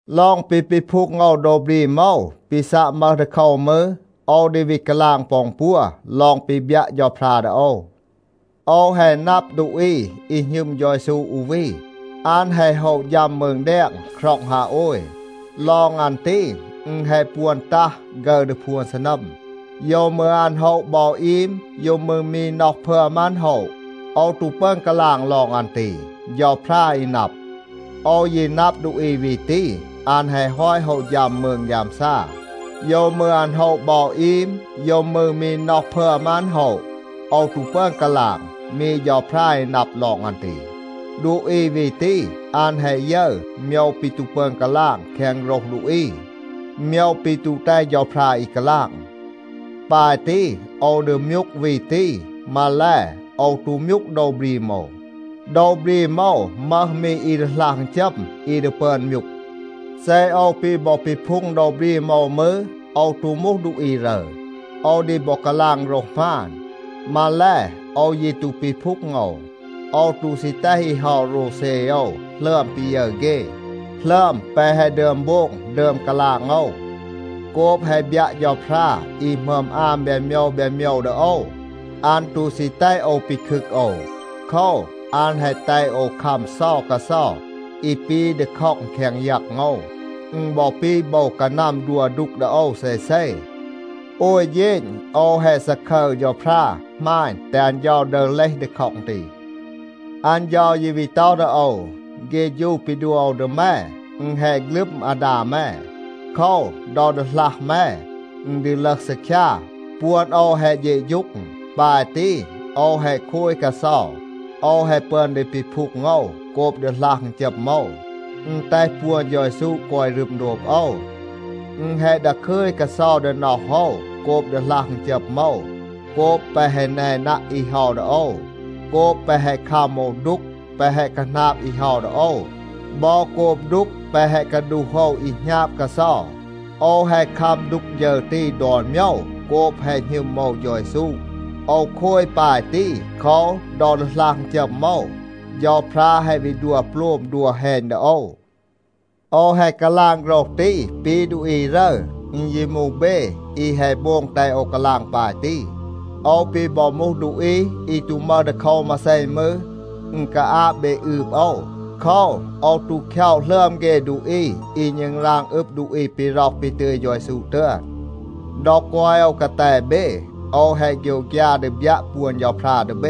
ลอง ปี ปีพูง โอว โดว บรีม โอว, ปี ซัะ มึห ดีโคว มืร, โอว ดี วี กาลาง ปอ อึณปัว ลอง ปี บยัะ เฌาพรา ดี โอว. โอว แฮะ นับ ดูอี อี หณึม เฌา เยซู อู วี, อัน แฮะ โฮะ ฌัม มืง แดง คร็อง ฮาโอย. ลอง อัน ตี, อึณ แฮะ ปวน ตัห ฆึร ดี พวน ซีนัม. (โยว มืร อัน โฮะ บอ อีม, โยว มืร มี น็อห พึอม อัน โฮะ, โอว ตู ปึอน กาลาง ลอง อัน ตี, เฌาพรา อี นับ). โอว ยี นับ ดูอี วี ตี, อัน แฮะ ฮอต โฮะ ฌัม มืง ฆยามซา. (โยว มืร อัน โฮะ บอ อีม, โยว มืร มี น็อห พึอม อัน โฮะ, โอว ตู ปึอน กาลาง, มี เฌาพรา อี นับ ลอง อัน ตี). ดูอี วี ตี, อัน แฮะ ยึร โมยว ปี ตู ปึอน กาลาง แคง โฆรห ดูอี, โมยว ปี ตู แตห เฌาพรา อี กาลาง. ปาย ตี, โอว ดี มยูก วี ตี. มาแล, โอว ตู มยูก โดว บรีม โอว. โดว บรีม โอว มึห มี อี ดีหลัห อึณจัม, อี ดี ปึอน มยูก. เซ โอว ปี บอ ปีพูง โดว บรีม โอว มืร, โอว ตู มูห ดูอี รึร. โอว ดี บอ กาลาง โฆรห หมาน. มาแล, โอว ยี ตู ปีพูง โอว. โอว ตู ซี แตห อี เฮา โรวเซ โอว หลึอม ปี ยึร เฆ, หลึอม แปะ แฮะ ดึอม โบง ดึอม กาลาง โอว. โกบ แฮะ บยัะ เฌาพรา อี หมึอม อาม แบน โมยว แบน โมยว ดี โอว, อัน ตู ซี แตห โอว ปีคึก โอว. โคว, อัน แฮะ แตห โอว คัม เซา กาเซา อี ปี ดีค็อง แคง ยัง โอว. อึณ บอ ปี โบว กานัม ดัว ดูก ดี โอว เซเซ. โอย เฌณ โอว แฮะ ซาคึร เฌาพรา, หมาณ, แตห อัน เฌา ดึห เลห ดีค็อง ตี. อัน เฌา ยี วี ต็อห ดี โอว, “เฆฌู ปี ดัว โอว ดี แม, อึณ แฮะ ฆลึม อาดา แม. โคว, ดอ ดีหลัห แม, อึณ ดี ลึห ซีคยา, ปวน โอว แฮะ เฌะฌูง.” ปาย ตี, โอว แฮะ โคย กาเซา, โอว แฮะ ปึอน ดี ปีพูง โอว โกบ ดีหลัห อึณจัม โอว. อึณ แตห ปวน เฌา เยซู กอย รึม โดบ โอว. อึณ แฮะ ดาคึย กาเซา ดี น็อห โอว โกบ ดีหลัห อึณจัม โอว, โกบ แปะ แฮะ แนนัะ อี เฮา ดี โอว, โกบ แปะ แฮะ คัม โอว ดูก แปะ แฮะ คาหนาบ อี เฮา ดี โอว บอ โกบ ดูก แปะ แฮะ กาดูห โอว อี หณาบ กาเซา. โอว แฮะ คัม ดูก ฌึร ตี ดอน โมยว โกบ แฮะ หณึม โอว เฌา เยซู. โอว โคย ปาย ตี, โคว, ดอ ดีหลัห อึณจัม โอว, เฌาพรา แฮะ วี ดัว โปลม, ดัว แฮณ ดี โอว. โอว แฮะ กาลาง โฆรห ตี ปี ดูอี รึร. อึณ ยี มูห เบ อี แฮะ โบง แตห โอว กาลาง ปาย ตี. โอว ปี บอ มูห ดูอี อี ตู มึห ดีโคว มาเซ มืร, อึณ กาอาบ เบ อืบ โอว. โคว, โอว ตู คย็อะ หลึอม เฆ ดูอี อี ณึงราง อึบ ดูอี ปี ร็อห ปี ตึย เฌา เยซู ตึอน. ดอ กอย โอว กาแต เบ, โอว แฮะ โฆยวฆยา ดี บยัะ ปวน เฌาพรา ดี เบ.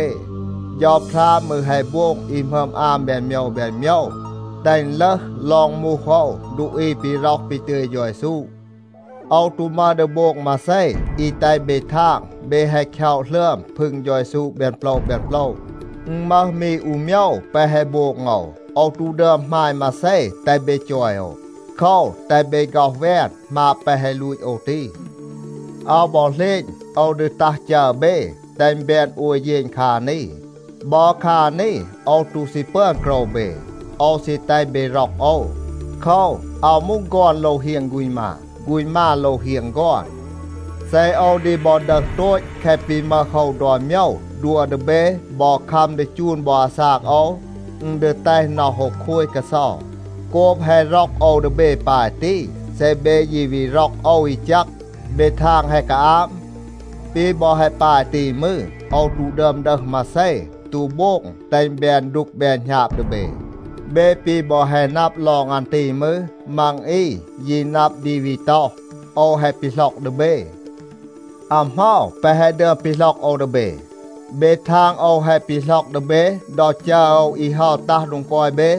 เฌาพรา มืร แฮะ โบง อี หมึอม อาม แบน โมยว แบน โมยว, แตห อึณ ลึห ลอง มูห โอว ดูอี ปี ร็อห ปี ตึย เฌา เยซู. โอว ตู มึห ดี โบง มาเซ อี แตห เบ ทาง เบ แฮะ คย็อะ หลึอม พึง เฌา เยซู แบน โปละ แบน โปละ. อึณ มึห มี อู โมยว แปะ แฮะ โบง โอว. โอว ตู ดึอม หมาณ มาเซ แตห เบ จอย โอว. โคว, แตห เบ ฆ็อห แวน หมาบ แปะ แฮะ ลูต โอว ตี. อาว บอ เหลณ โอว ดี ตัห จัร เบ, แตห อึณ แบน โอย เฌณ คา นี. บอ คา นี โอว ตู ซี ปึอน โกรว เบ. โอว ซี แตห เบ ร็อก โอว. โคว, อาว มูห ฆอน โลว เฮียง ฆูณ มา, ฆูณ มา โลว เฮียง ฆอน. เซ โอว ดี บอ ดึห โตต แคะ ปี มึห โอว ดอน โมยว, ดัว ดี เบ บอ คัม ดี จูน บอ อาซาก โอว, อึณ ดี แตห น็อห โอว โคย กาเซา. โกบ แฮะ ร็อก โอว ดี เบ ปาย ตี, เซ เบ ยี วี ร็อก โอว อี แจก, เบ ทาง แฮะ กาอาบ? ปี บอ แฮะ ปาย ตี มืร, โอว ตู ดึอม ดึห มาเซ, ตู โบง แตห อึณ แบน ดูก แบน หณาบ ดี เบ. เบ ปี บอ แฮะ นับ ลอง อัน ตี มืร, มัง อี ยี นับ ดี วี ต็อห, โอว แฮะ ปีหล็อก ดี เบ. อา เหมา แปะ แฮะ ดึอม ปีหล็อก โอว ดี เบ? เบ ทาง โอว แฮะ ปีหล็อก ดี เบ ดอ จัร โอว อี เฮา ตัห โดง กอย เบ?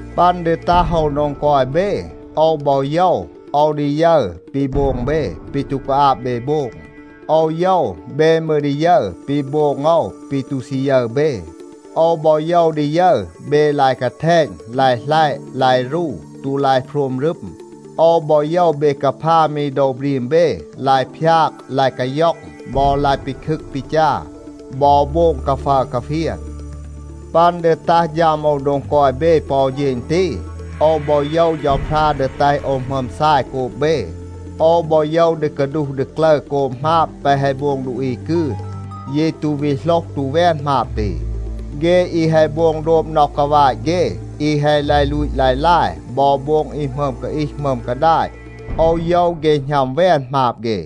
ปัน ดี ตัห โอว โดง กอย เบ, โอว บอ โยว, โอว ดี ยึร ปี โบง เบ, ปี ตู กาอาบ เบ โบง. โอว โยว, เบ มืร ดี ยึร ปี โบง โอว ปี ตู ซี ยึร เบ. โอว บอ โยว ดี ยึร เบ ลาย กาแทณ, ลาย หลัยะ, ลาย รู, ตู ลาย โพรม รึม. โอว บอ โยว เบ กาพา มี โดว บรีม เบ, ลาย พยาก, ลาย กาย็อง บอ ลาย ปีคึก ปีจา, บอ โบง กาฟัร กาเฟียน. ปัน ดี ตัห ฌัม โอว โดง กอย เบ ปอ อู เฌณ ตี, โอว บอ โยว เฌาพรา ดี แตห โอว หมึอม ซาย โกบ เบ. โอว บอ โยว ดี กาดูห ดี กลึร โกบ หมาบ แปะ แฮะ โบง ดูอี กืน, ยี ตู วี โหลห ตู แวน หมาบ ตี. เฆ อี แฮะ โบง โดบ น็อห กาวาต เฆ, อี แฮะ ลาย ลูต ลาย ลาย บอ โบง อี หมึอม กาอีห หมึอม กาดาต, โอว โยว เฆ หณัม แวน หมาบ เฆ.